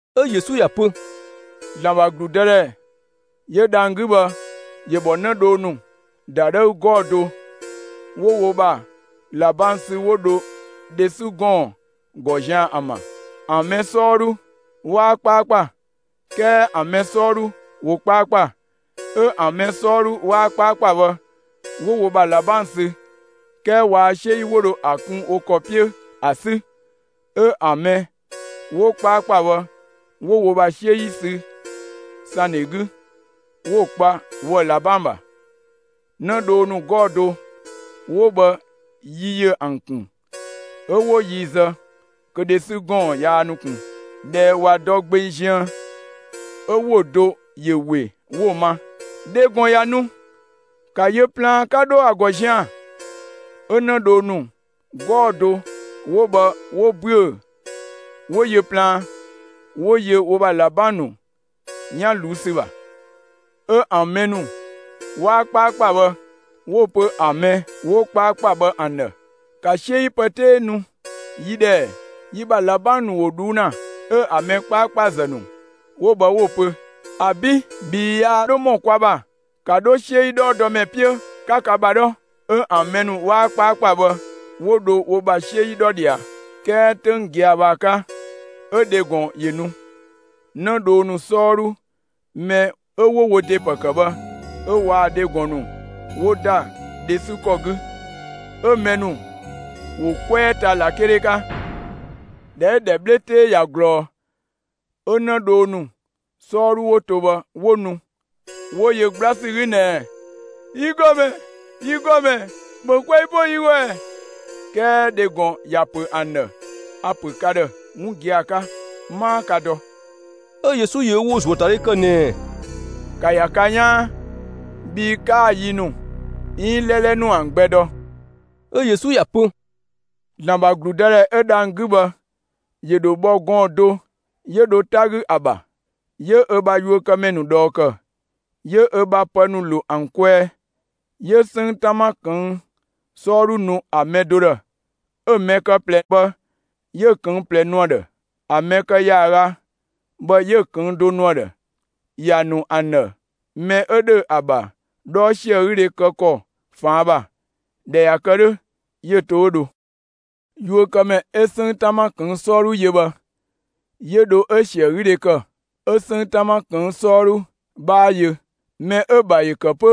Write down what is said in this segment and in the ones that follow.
'Ö Yesu ‑ya pö: «‑Zlan ‑bha ‑gludëdhɛ 'yö dhang‑ 'gü bhë ‑yö bhɔ 'në dhoo ‑nu ‑dadhëü 'gɔɔ‑ do 'wo wo ‑bha ꞊labang sü 'wo dho dhe 'sü ‑gɔɔn ‑gɔ zian‑ ‑an ‑bha. ‑An mɛ 'sɔɔdhu 'waa 'kpaakpa, 'kɛɛ ‑an mɛ 'sɔɔdhu ‑wo 'kpaakpa. 'Ö ‑an mɛ 'sɔɔdhu 'waa 'kpaakpa bhë 'wo wo bha ꞊labang sü, 'kɛɛ waa 'siö 'yi 'wo dho ‑a kun wo ‑kɔ 'piö ‑a 'sü. 'Ö ‑an mɛ 'wo 'kpaakpa bhë 'wo wo ‑bha 'siö 'yi sü ‑sandhe 'gü, 'wo‑ kpa woë‑ ꞊labang ‑bha. 'Në dhoo ‑nu 'gɔɔ‑ do 'wo bhë, yi ‑yö ‑an ‑kun 'ö 'wo yi zë kö dhe 'sü ‑gɔɔn yaa nu ꞊kun. ꞊Dhɛ ꞊wa dɔ gbeng ziën, 'ö ‑wo do ‑yö ‑we 'wo‑ ma: ‹Dhe ‑gɔn ꞊ya nu! ‑Ka yö plaan 'ka 'dho ‑a ‑gɔ zian‑!› 'Ö 'në dhoo ‑nu 'gɔɔ‑ do 'wo bhë 'wo ‑büö 'wo yö plaan, 'wo yö wo ‑bha ꞊labang ‑nu 'yan ꞊luu' ‑sü ‑bha. 'Ö ‑an mɛ ‑nu 'waa 'kpaakpa bhë 'wo‑ pö ‑an mɛ 'wo 'kpaakpa bhë ‑an ‑dhë: ‹‑Ka 'siö 'yi pë 'tee nu yi ‑dhë ‑ɛ, yi ‑bha ꞊labang ‑nu ‑wo ꞊dhuu' ‑na!› 'Ö ‑an mɛ 'kpaakpazë ‑nu 'wo bhë 'wo‑ pö: ‹‑Abi', bhii yaa 'dho ‑mɔ kwa ‑bha. ‑Ka 'dho 'siö 'yi 'dhɔɔdɔmɛ 'piö 'ka ka ‑bha 'dhɔ!› 'Ö ‑an mɛ ‑nu 'waa 'kpaakpa bhë 'wo dho wo ‑bha 'siö 'yi 'dhɔ ꞊dhia, 'kɛɛ 'töng gia‑ bhë ‑a 'ka, 'ö dhe ‑gɔn ‑yö nu. 'Në dhoo ‑nu 'sɔɔdhu mɛ 'ö 'wo wo ‑de ‑pë ‑kë bhë, 'ö waa‑ dhe ‑gɔn ‑nu 'wo ‑da dhe 'sü ‑kɔ 'gü, 'ö mɛ ‑nu ‑wo 'kwɛɛ ta ꞊lakele 'ka. ꞊Dhɛ 'ö‑ ‑dhɛ 'bhle 'tee ꞊ya ꞊glɔɔ, 'ö 'në dhoo ‑nu 'sɔɔdhu 'wo to bhë 'wo nu, 'wo yö 'gbla ‑sü 'gü ꞊nɛɛ: ‹Yi ‑gɔmɛ, yi ‑gɔmɛ, ‑bhö 'kwɛɛ 'po yi ‑gɔ ‑ɛ!› 'Kɛɛ dhe ‑gɔn ‑ya ‑pö ‑an ‑dhë: ‹A‑ ‑pö ka ‑dhë 'wun gia‑ 'ka 'maa kaa dɔ!›» 'Ö Yesu ‑yö ö ‑wo ‑zuöatadhe kë ꞊nɛɛ: «‑Ka ‑ya ka 'yaan, bhii 'kaa‑ yi ‑nu 'iin 'lɛlɛ ‑nu ‑an gbɛ dɔ!» 'Ö Yesu ‑ya pö: «‑Zlan ‑bha ‑gludëdhɛ 'ö dhang‑ 'gü bhë ‑yö ‑dho bhɔ gɔɔn‑ do 'yö dho 'ta 'gü ‑a ‑bha. 'Yö ö bha yuökëmɛ ‑nu ꞊dhɔɔ ‑kë, 'yö ö bha pë ‑nu ‑lo ‑an kwɛɛ. 'Yö 'sënng 'tama ꞊këng' 'sɔɔdhu nu ‑a mɛ do ‑dhë, 'ö‑ mɛ kë ꞊plɛ bhë 'yö‑ ꞊këng' ꞊plɛ nu ‑a ‑dhë; ‑a mɛ kë ‑yaaga bhë 'yö‑ ꞊këng' do nu ‑a ‑dhë. ‑Ya ‑nu ‑an ‑dhë mɛ 'ö ‑dhö ‑a ‑bha 'dhɔɔ ‑siögüdhe kë ‑kɔ ꞊faan' ‑bha. ꞊Dhɛ ꞊ya kë 'dhö, 'yö‑ to 'ö dho. Yuökëmɛ 'ö 'sënng 'tama ꞊këng' 'sɔɔdhu yö bhë 'yö dho 'ö‑ ‑siögüdhe ‑kë, 'ö 'sënng 'tama ꞊këng' 'sɔɔdhu 'bhaa yö. Mɛ 'ö‑ ‑bha ‑yö ‑kë 'pö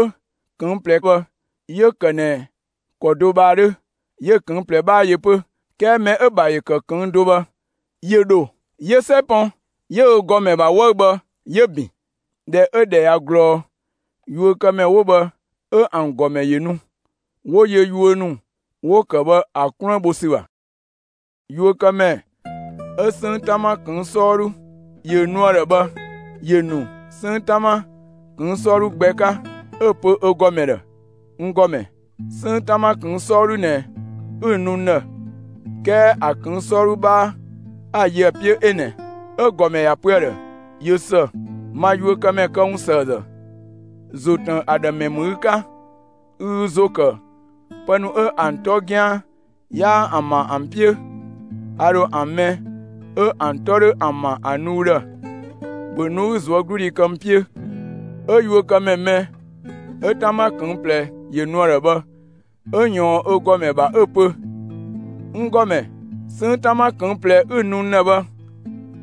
꞊këng' ꞊plɛ bhë, 'yö‑ ‑kë ꞊nɛ ‑kɔ do bhë ‑a 'dhö; 'yö‑ ꞊këng' ꞊plɛ 'bhaa yö 'pö. 'Kɛɛ mɛ 'ö‑ ‑bha ‑yö ‑kë ꞊këng' do bhë ‑yö ‑dho, 'yö 'sɛ pɔn, 'yö ö ‑gɔmɛ ‑bha 'wëü‑ bhë 'yö‑ ‑bin. ꞊Dhɛ 'ö‑ ‑dhɛ ꞊ya ꞊glɔɔ, yuökëmɛ ‑nu 'wo bhë 'ö ‑an ‑gɔmɛ ‑yö nu, 'wo yö yuö ‑nu 'wo‑ ‑kë bhë ‑a 'kluën bho ‑sü ‑bha. Yuökëmɛ 'ö 'sënng 'tama ꞊këng' 'sɔɔdhu ‑yö nu ‑a ‑dhë bhë, ‑yö ‑nu 'sënng 'tama ꞊këng' 'sɔɔdhu gbɛ 'ka, 'ö‑ pö ö ‑gɔmɛ ‑dhë: ‹N ‑gɔmɛ, 'sënng 'tama ꞊këng' 'sɔɔdhu ꞊nɛ 'ü‑ nu n ‑dhë, 'kɛɛ ‑a ꞊këng' 'sɔɔdhu 'bhaa 'a‑ yö ‑a 'piö 'ö ꞊nɛ.› 'Ö‑ ‑gɔmɛ ‑ya pö ‑a ‑dhë: ‹꞊Yö ‑së, ma yuökëmɛ këwunsëëzë, ‑zo ‑tën ‑a ‑dhë ‑mɛ ‑mü ü 'ka; ü ü ‑zo ‑kë pë ‑nu 'ö ‑an 'tɔ 'gian 'yaa ‑an ‑bha ‑an 'piö; a ‑dho ‑an mɛ 'ö ‑an 'tɔ 'dho ‑an ‑bha ‑a nu ü ‑dhë. ‑Bhö nu 'ü ꞊zuögludhi kë n 'piö!› 'Ö yuökëmɛ mɛ 'ö 'tama ꞊këng' ꞊plɛ ‑yö nu ‑a ‑dhë bhë, 'ö ꞊yɔɔn ö ‑gɔmɛ ‑bha 'ö‑ pö: ‹N ‑gɔmɛ, 'sënng 'tama ꞊këng' ꞊plɛ 'ü‑ nu n ‑dhë bhë,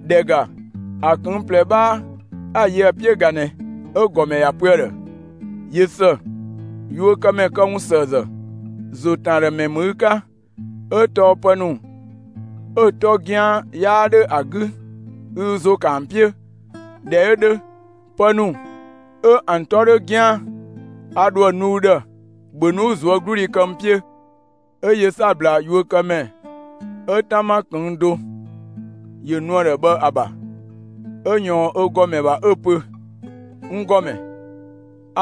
‑dhɛ ‑ga, ‑a ꞊këng' ꞊plɛ 'bhaa 'a‑ yö ‑a 'piö ꞊ga ꞊nɛ!› 'Ö‑ ‑gɔmɛ ‑ya pö ‑a ‑dhë: ‹꞊Yö ‑së, yuökëmɛ këwunsëëzë, ‑zo ‑tën ‑a ‑dhë ‑mɛ ‑mü ü 'ka; 'ö tɔɔ pë ‑nu 'ö‑ 'tɔ 'gian 'yaa 'dhö ‑a 'gü, ü ü ‑zo ‑kë ‑an 'piö. ꞊Dhɛ 'ö 'dhö, pë ‑nu 'ö ‑an 'tɔ 'dho 'gian ‑a nu ü ‑dhë. ‑Bhö nu, 'ü ꞊zuögludhi kë n 'piö!› 'Ö yö 'sabla yuökëmɛ mɛ 'ö 'tama ꞊këng' do ‑yö nu ‑a ‑dhë bhë ‑a ‑bha, 'ö ꞊yɔɔn ö ‑gɔmɛ ‑bha 'ö‑ pö: ‹N ‑gɔmɛ,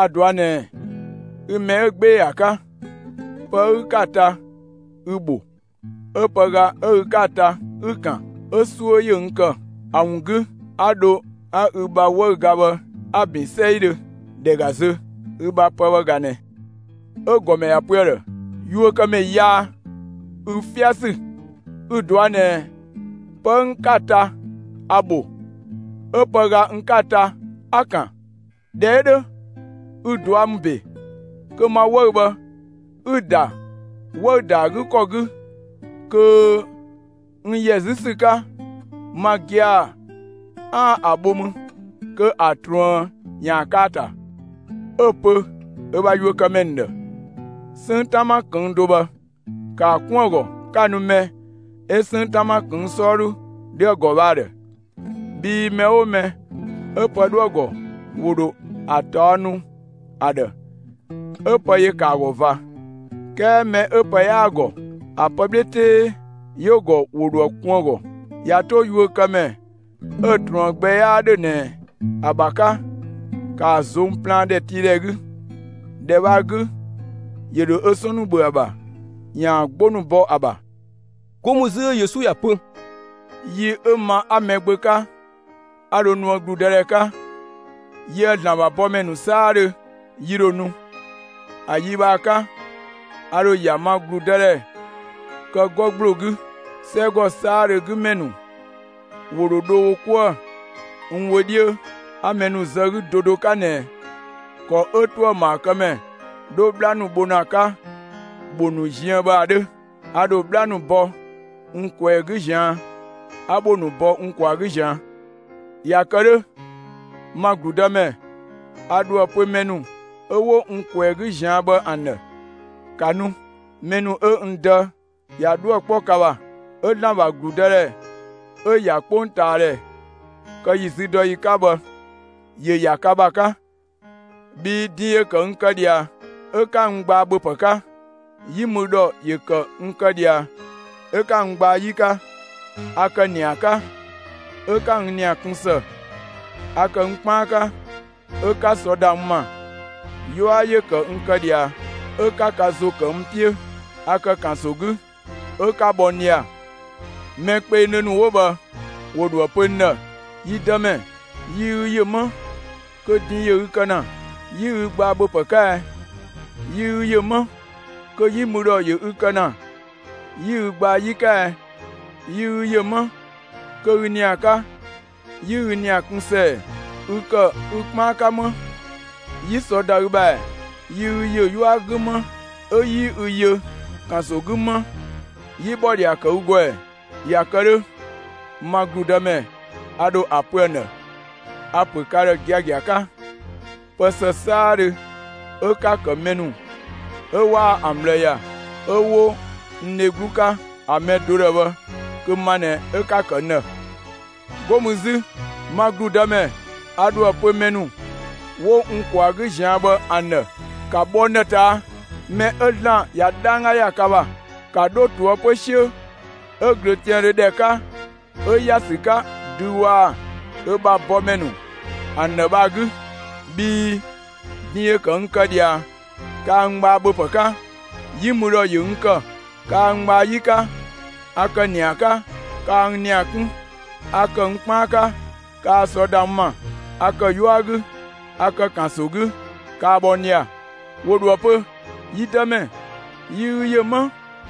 a‑ ꞊dɔa' ꞊nɛ ü mɛ 'ö 'gbee‑ ‑a 'ka, pë 'ö ü 'ka‑ ta, ü‑ ‑bho, 'ö pëga 'ö ü 'ka‑ ta, 'ü‑ ‑kan. 'Ö 'suö ‑yö n ‑kë. ‑A ‑wun 'gü 'a dho 'a ü bha 'wëüga bhë 'a‑ ‑bin 'sɛidhö. ‑Dhɛ ‑ga zö, ü bha pë bhë ꞊ga ꞊nɛ.› 'Ö‑ ‑gɔmɛ ‑ya pö ‑a ‑dhë: ‹Yuökëmɛ yaa, ü 'fiasü, ü‑ ꞊dɔa' ꞊nɛ pë 'ö n 'ka‑ ta, a‑ ‑bho, 'ö pëga n 'ka‑ ta, 'a‑ ‑kan. ꞊Dhɛ 'ö 'dhö, ü ꞊dua' ‑mü ‑be kö ma 'wëü‑ bhë 'ü‑ ‑da 'wëü‑ ‑da ‑a 'gü ‑kɔ 'gü, kö n ‑yɛ 'zü ‑sü 'ka, ma gia‑ 'aan‑ ‑a bho mü kö ‑a ꞊truën ‑yaan kë ‑a ‑ta!› 'Ö‑ pö ö bha yuökëmɛ ‑nu ‑dhë: ‹'Sënng 'tama ꞊këng' do bhë ‑kaa 'kun ‑a ‑gɔ 'ka‑ nu mɛ 'ö 'sënng 'tama ꞊këng' 'sɔɔdhu 'dho ‑a ‑gɔ bhë ‑a ‑dhë. Bhii mɛ 'oo mɛ 'ö pë 'dhoë‑ ‑gɔ, ‑wo ‑dho ‑a ꞊taɔ' nu ‑a ‑dhë, 'ö pë ‑yö ‑kë ‑a ‑gɔ ꞊va, 'kɛɛ mɛ 'ö pë 'yaa‑ ‑gɔ, ‑a pë 'bhle 'tee 'yö‑ ‑gɔ, ‑wo ‑dho ‑a kun ‑a ‑gɔ. ꞊Ya 'to yuökëmɛ 'ö‑ ꞊truën gbɛ 'yaa ‑dhö ꞊nɛ ‑a ‑bha 'ka, ‑kaa ꞊zong' plaan ‑dhɛtiidhɛ 'gü! ‑Dhɛ bhë ‑a 'gü, 'yö dho ö 'sɔn ‑nu ‑bhö ‑a ‑bha, ‑yaan 'gbo ‑nu bɔ ‑a ‑bha.›» 'Go mü 'zü 'ö Yesu ‑ya pö: «Yi 'ö ma 'a Mɛgbö 'ka 'a dho nuë ‑gludë 'ka, yië‑ ‑Zlan ‑bha bɔmɛ ‑nu 'saadhö yi ‑dho nu. ‑A yi bhë ‑a 'ka a ‑dho ‑ya ma ‑gludëdhɛ kë 'gɔ ‑gbloo 'gü. 'Sɛgɔ 'saadhö 'gü ‑mɛ ‑nu ‑wo ‑dho dho wo 'kuë‑ n wö 'dhiö, 'a mɛ ‑nu zë 'gü do do 'ka ꞊nɛ ‑kɔ 'ö ‑tuëmaakëmɛ 'dho 'bhla ‑nu bho ‑na 'ka ‑bho ‑nu ziën bhë ‑a 'dhö. A ‑dho 'bhla ‑nu bɔ n ꞊kwɛɛ‑ 'gü ꞊zian', 'a ‑bho ‑nu bɔ n kwaa‑ 'gü ꞊zian'. ꞊Ya kë 'dhö, ma ‑gludëmɛ, a ‑dhoë pö mɛ ‑nu 'ö 'wo n ꞊kwɛɛ‑ 'gü ꞊zian' bhë ‑an ‑dhë: ‹‑Ka nu, mɛ ‑nu 'ö n Dë ꞊ya 'dhuë‑ 'kpɔ ka ‑bha, 'ö ‑Zlan ‑bha ‑gludëdhɛ 'ö‑ ‑ya 'kpongtaadhɛ kë ‑yi züdɔyi 'ka bhë, ‑yö ‑ya ka ‑bha 'ka. Bhii din ‑yö ‑kë n kë ꞊dhia, 'ö 'ka n gbaa ‑bhöpë 'ka. 'Yi mü ‑dhɔ ‑yö ‑kë n kë ꞊dhia, 'ö 'ka n gbaa 'yi 'ka. A ‑kë ‑nia 'ka, 'ö 'ka n ‑nia 'kun ‑së. A ‑kë n 'kpaan 'ka, 'ö 'ka sɔ ‑da n ‑ma. 'Yua ‑yö ‑kë n kë ꞊dhia, 'ö 'ka ka ‑zo ‑kë n 'piö. A ‑kë ‑kanso 'gü, 'ö 'ka bhɔ n ꞊dhia.› Mɛ kpengdhö ‑nu 'wo bhë ‑wo ‑dho ‑a pö n ‑dhë: ‹Yi Dëmɛ, yi ü ‑yö 'më kö din ‑yö ü kë ‑na, 'yi ü gbaa ‑bhöpë 'ka ɛ? 'Yi ü yö 'më kö 'yi mü ‑dhɔ ‑yö ü kë ‑na, 'yi ü gbaa 'yi 'ka ɛ? Yi ü ‑yö 'më kö ü ‑nia 'ka, 'yi ü ‑nia kun ‑së ‑ɛ? Ü ‑kë ü 'kpaan 'ka 'më, 'yi sɔ ‑da ü ‑bha ‑ɛ? Yi ü ‑yö 'yua 'gü 'më, 'ö 'yi ü yö ‑kanso 'gü 'më, 'yi ‑bhɔdhia ‑kë ü ‑gɔ ‑ɛ?› ꞊Ya kë 'dhö, ma ‑gludëmɛ, a ‑dho ‑a pö ‑an ‑dhë: ‹A‑ ‑pö ka ‑dhë giagia 'ka: Pë ‑së 'saadhö 'ö 'ka‑ ‑kë mɛ ‑nu 'ö 'waa ‑an ꞊bhlë ‑ya 'ö 'wo n dheglu 'ka ‑a mɛ do ‑dhë bhë, kö ma ꞊nɛ 'ö 'ka‑ ‑kë n ‑dhë.› 'Go mü 'zü, ma ‑gludëmɛ, a ‑dho ‑a pö mɛ ‑nu 'wo n ꞊kwaa‑ 'gü ꞊zian' bhë ‑an ‑dhë: ‹‑Ka bhɔ n ‑dhë ꞊taa', mɛ 'ö ‑Zlan ꞊ya 'dhangga ‑ya ka ‑bha! ‑Ka 'dho ꞊toëpö 'siö 'ö ꞊glöötiaandhö ‑dhɛ 'ka 'ö ‑ya ‑sü 'ka dü waa‑ ö bha bɔmɛ ‑nu ‑an ‑dhë bhë ‑a 'gü! Bhii din ‑yö ‑kë n kë ꞊dhia, kaa n gbaa ‑bhöpë 'ka, 'yi mü ‑dhɔ ‑yö n ‑kë, kaa n gbaa 'yi 'ka. A ‑kë ‑nia 'ka, kaa n ‑nia 'kun, a ‑kë n 'kpaan 'ka, kaa sɔ ‑da n ‑ma. A ‑kë 'yua 'gü, a ‑kë ‑kanso 'gü, kaa bhɔ n ꞊dhia.› ‑Wo ‑dhoë pö: ‹Yi Dëmɛ, yi ü ‑yö 'më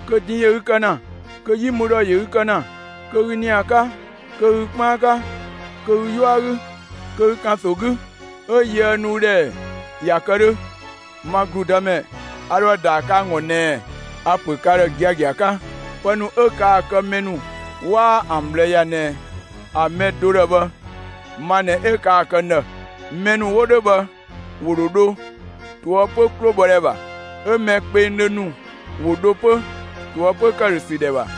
kö din ‑yö ü kë ‑na, kö 'yi mü ‑dhɔ ‑yö ü kë ‑na, kö ü ‑nia 'ka, kö ü 'kpaan 'ka, kö ü 'yua 'gü, kö ü ‑kanso 'gü, 'ö yiëë nu ü ‑dhë ‑ɛ?› ꞊Ya kë 'dhö, ma ‑gludëmɛ, a ‑dho ‑a ‑daa kë ‑an ‑gɔ ꞊nɛɛ: ‹A‑ ‑pö ka ‑dhë giagia 'ka: Pë ‑nu 'ö kaa‑ kë mɛ ‑nu 'waa ‑an ꞊bhlë ‑ya ꞊nɛ ‑a mɛ do ‑dhë bhë, ma ꞊nɛ 'ö kaa‑ kë n ‑dhë.› Mɛ ‑nu 'wo 'dhö bhë ‑wo ‑dho dho ꞊toëpö 'klobhɔdhɛ ‑bha. 'Ö mɛ kpengdhö ‑nu ‑wo dho 'pö ꞊toëpö ‑këdhösü ‑dhɛ ‑bha.»